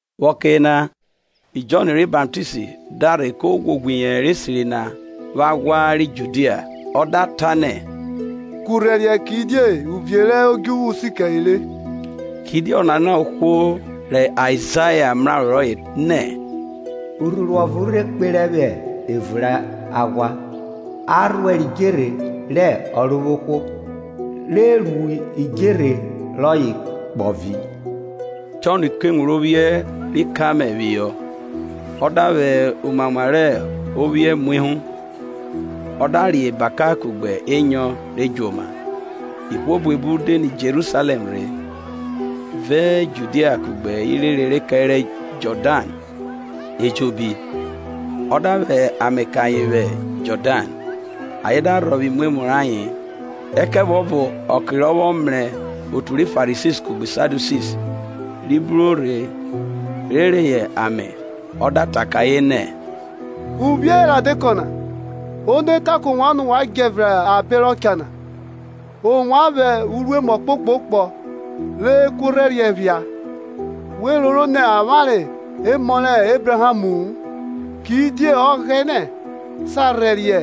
Vwẹ ọke yena Jọn ri Baptist da rhe ko ghwoghwo iyẹnrẹ esiri na vwẹ aghwa ri Judia, ọ da ta nẹ, Kurhẹriẹ, kidie uvie rẹ odjuvwu si kẹre re. Kidie ọnana hẹ ohwo rẹ Aizaya mraro rọye nẹ, Urhuru ọvo re kperẹ vwẹ evun rẹ aghwa, A rhuẹrẹ idjerhe rẹ Ọrovwohwo, Re ru idjerhe rọye kpọvi. Jọn ku ewun rẹ ophiẹn ri kamẹl phihọ, ọ da vwẹ umuamwa rẹ ophiẹn mu ehu; ọ da re ebaka kugbe enyọn re djoma. Ihwo buebu de nẹ Jerusalẹm rhe, vẹ Judia kugbe irere re kẹrẹ Jọdan ejobi. Ọ da vwẹ ame kẹ ayen vwi Jọdan, ayen da rhọvwe imwemwu rayen. Ẹkẹvuọvo ọke rọ vwọ mrẹ otu ri Farisi kugbe Sadiusi ri bruro rhe rhe reyọ ame, ọ da ta kẹ ayen nẹ, Uvwiẹ rẹ eredekọ na, Ono ta kẹ ovwan nẹ wa djẹ nẹ abe rọ cha na? Ovwan vwẹ uruemu ọkpokpọ rẹ ekuorhẹriẹ phia, we roro nẹ avwanre emọ rẹ Ebrahamu-u, kidie Ọghẹnẹ sa rhẹriẹ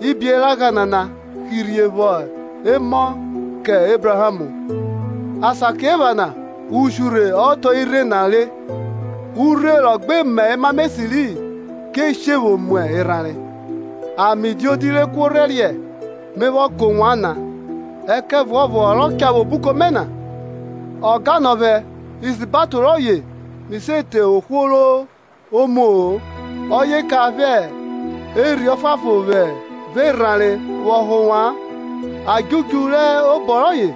ibieragha nana hirhe vwọ emọ kẹ Ebraham. Asakiephana ushurhe ọ hẹ otọ rẹ irhe na re, urhe rọ gbe mọ emamọ esiri-i, ke she vwo mu erhanre. Ame diodi rẹ ekuorhẹriẹ me vwọ kẹ ovwan na, ẹkẹvuọvo ọ rọ cha vwẹ obuko mẹ na, o gan nọ vwẹ, isabato rọye mi se te ohwo ro muo-o; ọye cha vwẹ Erhi Ọfuanfon vẹ erhanre vwọ họ ovwan. Adjudju hẹ obọ rọye,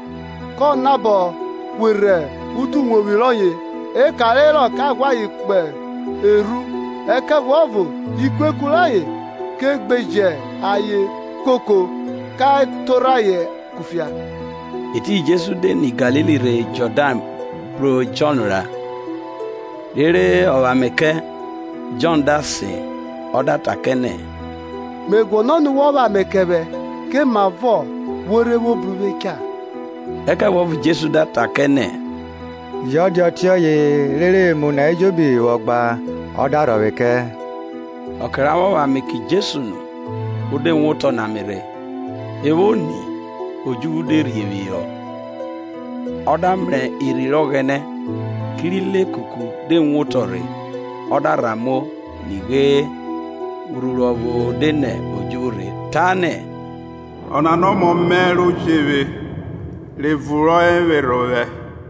kọ nabọ hwerhe utuwevwi rọye, eka re herọ ka ghwẹ ayen kpo erhu, ẹkẹvuọvo ikueku re herọ ke gbeje ayen koko, ka torhẹ ayen kufia. Etiyin Jesu de nẹ Galili rhe Jọdan bru Jọn ra, rere ọ vwẹ ame kẹ. Jọn da sen, ọ da ta kẹ nẹ, Me guọnọ nẹ wọ vwẹ ame kẹ vwẹ, komavọ wo rhe vwo bru uvwe cha? Ẹkẹvuọvo Jesu da ta kẹ nẹ, Jọ dia ọtiọye; rere emu na ejobi vwọ gba ọ da rhọvwe kẹ. Ọke ra vwọ vwẹ ame kẹ Jesu nu, o de wotọ nẹ ame rhe; e vwo ni, odjuvwu de rhie phihọ, ọ da mrẹ Erhi rẹ Ọghẹne kerẹ ilekuku de woto rhe, ọ da rhan muo. Nighe, urhuru ọvo de nẹ odjuvwu rhe ta nẹ, Ọnana hẹ ọmọ mẹ ro je vwe, rẹ evun rọye vwerhe ovwẹ.